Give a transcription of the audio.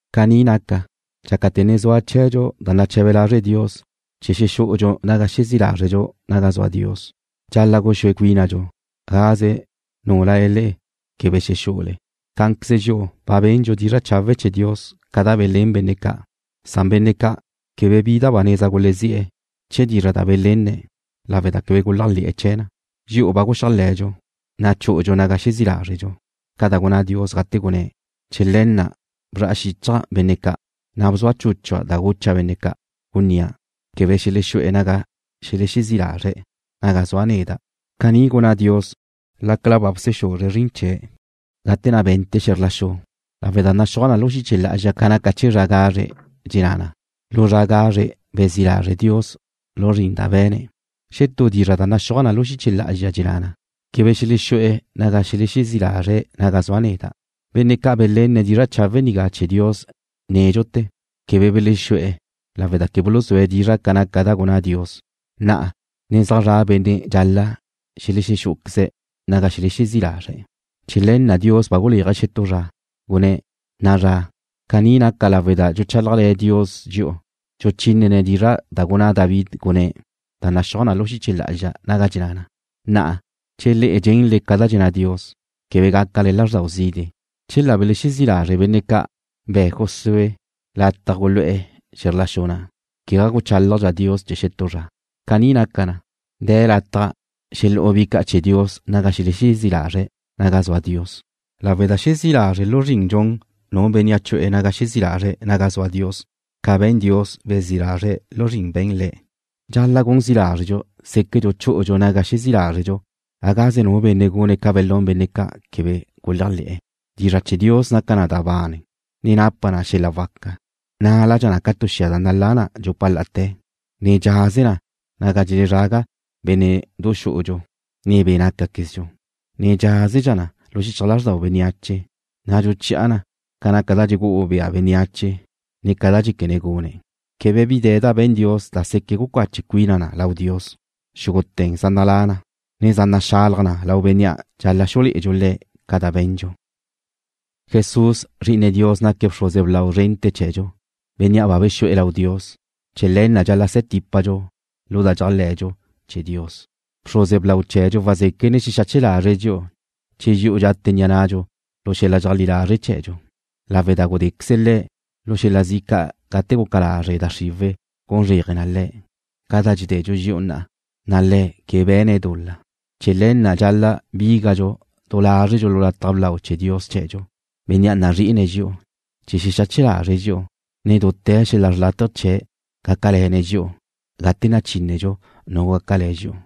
Caní naca, dxácate̱ ne zua chee̱dxu da nache̱be lazre' Dios chee̱ xexú'udxu naga xezí' lázredxu naga zua Dios, dxal-la' guxúe cuínadxu gagáze nule le'e quebe xexú'ule. Cá'anqueze dxi'u ba bendxu dizra' chawe' chee̱ Dios ca da belén benne' ca', san benne' ca' quebe bi da ba neza gulezí'e̱ chee̱ dizra' da belenne̱' lawe' da quebe guléajle̱'e̱ chee̱ na. Dxi'u ba guxéajle̱dxu, na' chú'udxu naga xezí' lázredxu, ca da gunná Dios gate gunné̱': Chee̱ le̱ na' bzra'a xichja' benne' ca', na' bzua chúchua' da gucha' benne' ca', gunnía': Quebe xelexú'e̱ naga xelexezí' lazre̱' naga zua neda'. Caní gunná Dios lácala ba bsexuzre̱' zrin chee̱' gate na' be̱nte̱' xe̱zr la xu, lawe' da naxúaj na lu xiche lá'azxa ca naca chee̱ zra gazre', dxenná na: Lu zra gazre bezí' lazre' Dios lu zrin da be̱ne̱'. Xetú dizra' da naxúaj na lu xiche lá'azxa dxenná na: Quebe xelexú'e̱ naga xelexezí' lazre̱' naga zua neda'. Benne' ca' belenne̱' dizra' chawe' nigá chee̱ Dios nédxute̱ quebe belexú'e̱ lawe' da quebe buluzúe̱' dizra' ca naca da gunná Dios. Na'a ne zaj zra' benne' dxal-la' xelexú'uqueze̱' naga xelexezí' lazre̱'. Chee̱ le̱ na' Dios ba guléaje̱' xetú zra, gunné̱': Na'a zra. Caní naca lawe' da dxuchálajle̱ Dios dxi'u dxuchínene̱' dizra' da gunná David gudé na', da naxúaj na lu xiche lá'azxa naga dxenná na: Na'a, che le'e dxenle ca da dxenná Dios, quebe gácale lázrdau zide'. Chela belexezí' lazre' benne' ca' be̱ Josué lataj gulu'e̱ xe̱zr la xu na', quegá guchálajdxa Dios chee̱ xetú zra. Caní naca na, de̱ lataj xelú'u bi ca' chee̱ Dios naga xelexezí' lazre̱' naga zua Dios, lawe' da xezí' lazre' lu zrin dxun nu benne' chu'e̱ naga xezí' lazre̱' naga zua Dios, ca be̱n Dios, bezí' lazre̱' lu zrin be̱n Le̱'. Dxal-la' gun zi lázredxu séquedxu chú'udxu naga xezí' lázredxu gagáze nu benne' gune̱' ca belún benne' ca' quebe guléajle̱'e̱. Dizra' chee̱ Dios naca na da bane, ne napa na xel-la' waca. Naládxa na ca tu xia da nalá na dxupa la'ate̱, ne dxaze na naga dxelezraga bénne'du xú'udxu, ne be' nácaquezdxu, ne dxaze na lu xichaj lázrdau bénneache, na' dxuchi'a na ca naca da dxugú'u bea bénneache ne ca da dxéquene̱' gune̱'. Quebe bi de̱ da be̱n Dios da seque' gucache cuina na lau Dios. Xúgute̱ zaj nalá' na, ne zaj naxalaj na lau Bénnea' dxal-la' xulé'edxu Le̱' ca da be̱ndxu. Jesús, Zri'ine Dios naque̱' bxruze blau zrente̱ chee̱dxu, Bénnea' ba bexu'e̱ lau Dios. Chee̱ le̱ na' dxal-la' se̱ típadxu lu da dxéajle̱dxu chee̱ Dios. Bxruze blau chee̱dxu wazéquene̱' xexache lazre̱' dxi'u che dxi'u dxate ni'a nadxu lu xel-la' dxeajlí lazre' chee̱dxu, lawe' da gudéqueze Le̱' lu xel-la' zi' ca' gate guca lazre da xriwe̱' gun zréaje na Le̱', ca da dxededxu dxi'u na'a, na' Le̱' quebe be̱ne̱' dul-la. Chee̱ le̱ na' dxal-la' bígadxu du lázredxu lu lataj blau chee̱ Dios chee̱dxu, Bénnea' nazri'ine̱' dxi'u, chee̱ xexache lazre̱' dxi'u, ne dute̱ xel-la' xrlátaje chee̱' gácale̱ne̱' dxi'u gate nachínedxu nu gácale̱ dxi'u.